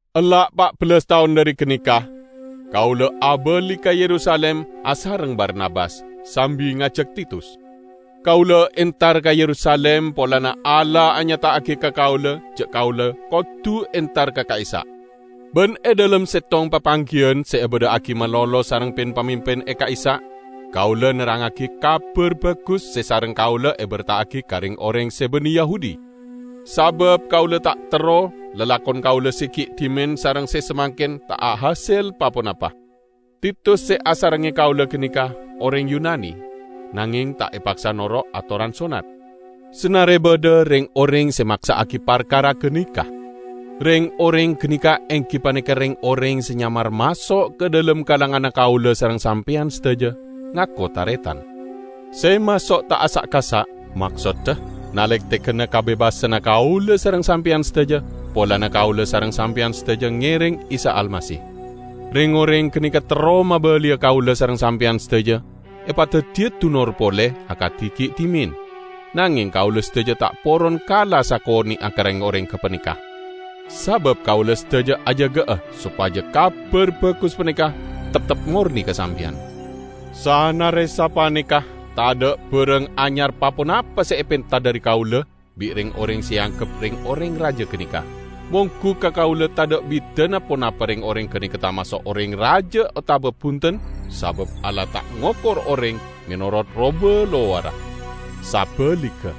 Ella' pa' bellas taon dhari ganeka, kaula abali ka Yerusalim asareng Barnabas, sambi ngajak Titus. Kaula entar ka Yerusalim polana Allah anyata'agi ka kaula ja' kaula kodu entar ka ka'issa'. Ban e dhalem settong papanggiyan se ebadha'agi malolo sareng pin-pamimpin e ka'issa', kaula nerrangngagi Kabar Bagus se sareng kaula eberta'agi ka reng-oreng se banne Yahudi. Sabab kaula ta' terro lalakon kaula se gi' dhimen sareng se samangken ta' ahasel pa-ponapa. Titus se asarengnge kaula ganeka oreng Yunani, nangeng ta' epaksa noro' atoran sonnat, sanare badha reng-oreng se maksa'agi parkara ganeka. Reng-oreng ganeka enggi paneka reng-oreng se nyamar maso' ka dhalem kalanganna kaula sareng sampeyan sadaja, ngako taretan. Se maso' ta' asa'-kasa', maksodda nalektegana kabebasanna kaula sareng sampeyan sadaja polana kaula sareng sampeyan sadaja ngereng Isa Almasih. Reng-oreng ganeka terro mabaliya kaula sareng sampeyan sadaja epadaddiya dunor pole akadi gi' dhimen, nangeng kaula sadaja ta' poron kala sakone'a ka reng-oreng gapaneka, sabab kaula sadaja ajaga'a sopaja Kabar Bagus paneka teptep morne ka sampeyan. Sanare sapaneka, tadha' barang anyar pa-ponapa se epenta dhari kaula bi' reng-oreng se eanggep reng-oreng raja ganeka -- monggu ka kaula tadha' bidana ponapa reng-oreng ganeka tamaso' oreng raja otaba bunten, sabab Allah ta' ngokor oreng menorot roba lowarra. Sabaligga,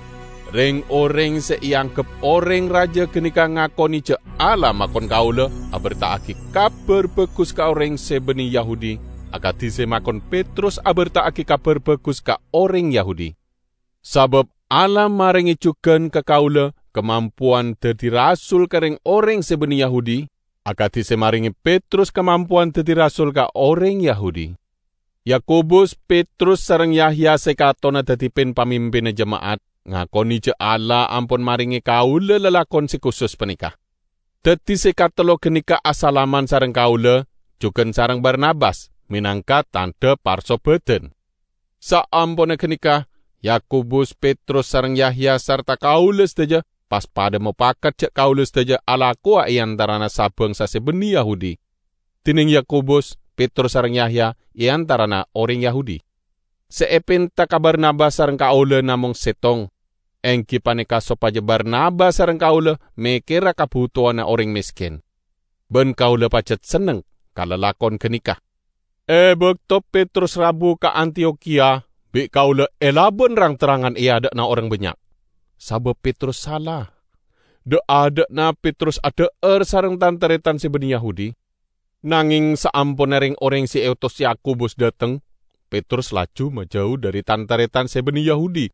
reng-oreng se eanggep oreng raja ganeka ngakone ja' Allah makon kaula aberta'agi Kabar Bagus ka oreng se banne Yahudi, akadi se makon Petrus aberta'agi Kabar Bagus ka oreng Yahudi. Sabab Allah marenge jugan ka kaula kamampowan daddi rasul ka reng-oreng se banne Yahudi, akadi se marenge Petrus kamampowan daddi rasul ka oreng Yahudi. Yakobus, Petrus sareng Yahya se katonna daddi pin-pamimpinna jema'at, ngakone ja' Allah ampon marenge kaula lalakon se kusus paneka. Daddi se katello ganeka asalaman sareng kaula, jugan sareng Barnabas, menangka tandha parsobadan. Saamponna ganeka, Yakobus, Petrus sareng Yahya sarta kaula sadaja pas padha mopakat ja' kaula sadaja alakowa e antarana sa-bangsa se banne Yahudi, dineng Yakobus, Petrus sareng Yahya e antarana oreng Yahudi. Se epenta ka Barnabas sareng kaula namong settong, enggi paneka sopaja Barnabas sareng kaula mekkera kabutowanna oreng mesken. Ban kaula pajat senneng ka lalakon ganeka. E bakto Petrus rabu ka Antiyokhiya, bi' kaula elaban rang-terrangan e adha'na oreng bannya', sabab Petrus sala. Dha'-adha'na, Petrus adha'ar asareng tan-taretan se banne Yahudi. Nangeng saamponna reng-oreng se eotos Yakobus dhateng, Petrus laju majau dhari tan-taretan se banne Yahudi,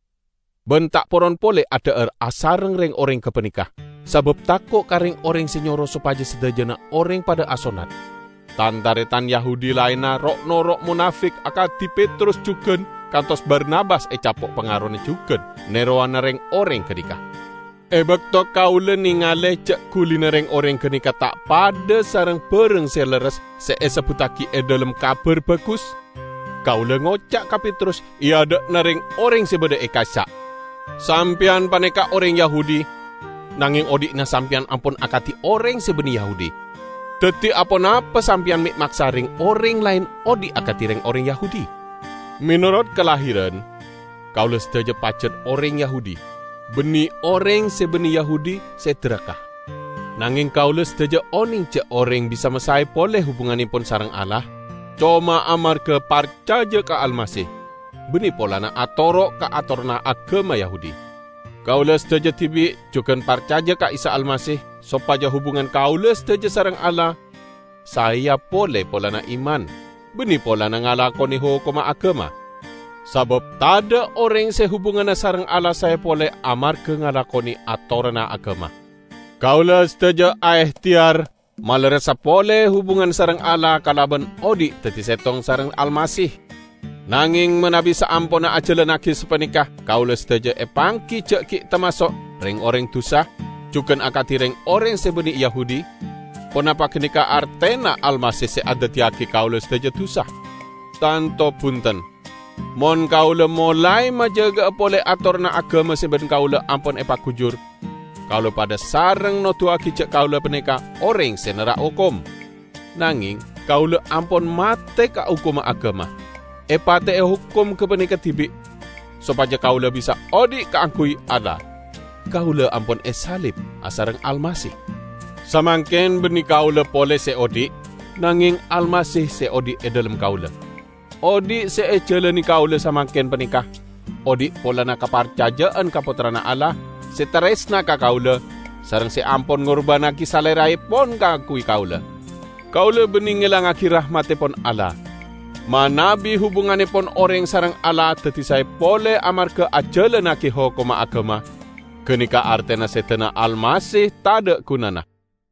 ban ta' poron pole adha'ar asareng reng-oreng gapaneka, sabab tako' ka reng-oreng se nyoro sopaja sadajana oreng padha asonnat. Tan-taretan Yahudi laenna ro'-noro' monafek akadi Petrus jugan, kantos Barnabas ecapo' pangarona jugan nerowana reng-oreng ganeka. E bakto kaula nengale ja' gulina reng-oreng ganeka ta' padha sareng barang se lerres se esebbuttagi e dhalem Kabar Bagus, kaula ngoca' ka Petrus e adha'na reng-oreng se badha ka'issa', "Sampeyan paneka oreng Yahudi, nangeng odhi'na sampeyan ampon akadi oreng se banne Yahudi. Daddi aponapa sampeyan me' maksa reng-oreng laen odhi' akadi reng-oreng Yahudi?" Menorot kalahiran, kaula sadaja pajat oreng Yahudi, banne "oreng se banne Yahudi se daraka". Nangeng kaula sadaja oneng ja' oreng bisa masae pole hubungannepon sareng Allah coma amarga parcaja ka Almasih, banne polana atoro' ka atoranna agama Yahudi. Kaula sadaja dibi' jugan parcaja ka Isa Almasih sopaja hubungan kaula sadaja sareng Allah saeya pole polana iman, banne polana ngalakone hokomma agama. Sabab tadha' oreng se hubunganna sareng Allah sae pole amarga ngalakone atoranna agama. Kaula sadaja aehteyar malerressa pole hubungan sareng Allah kalaban odhi' daddi settong sareng Almasih. Nangeng manabi saamponna ajalannagi sapaneka kaula sadaja epanggi ja' gi' tamaso' "reng-oreng dusa" jugan akadi reng-oreng se banne Yahudi, ponapa ganeka artena Almasih se andaddiyagi kaula sadaja dusa? Tanto bunten! Mon kaula molae majaga'a pole atoranna agama se ban kaula ampon epagujur, kaula padha sareng noduwagi ja' kaula paneka oreng se nerrak hokom. Nangeng, kaula ampon mate ka hokomma agama -- epate'e hokom gapaneka dibi' -- sopaja kaula bisa odhi' kaangguy Allah. Kaula ampon esalib asareng Almasih. Samangken banne kaula pole se odhi', nangeng Almasih se odhi' e dhalem kaula. Odhi' se ejalane kaula samangken paneka odhi' polana kaparcaja'an ka Pottrana Allah se taresna ka kaula, sareng se ampon ngurbannagi Saleraepon kaangguy kaula. Kaula banne ngelangngagi rahmattepon Allah. Manabi hubungannepon oreng sareng Allah daddi sae pole amarga ajalannagi hokomma agama, ganeka artena sedana Almasih tadha' gunana!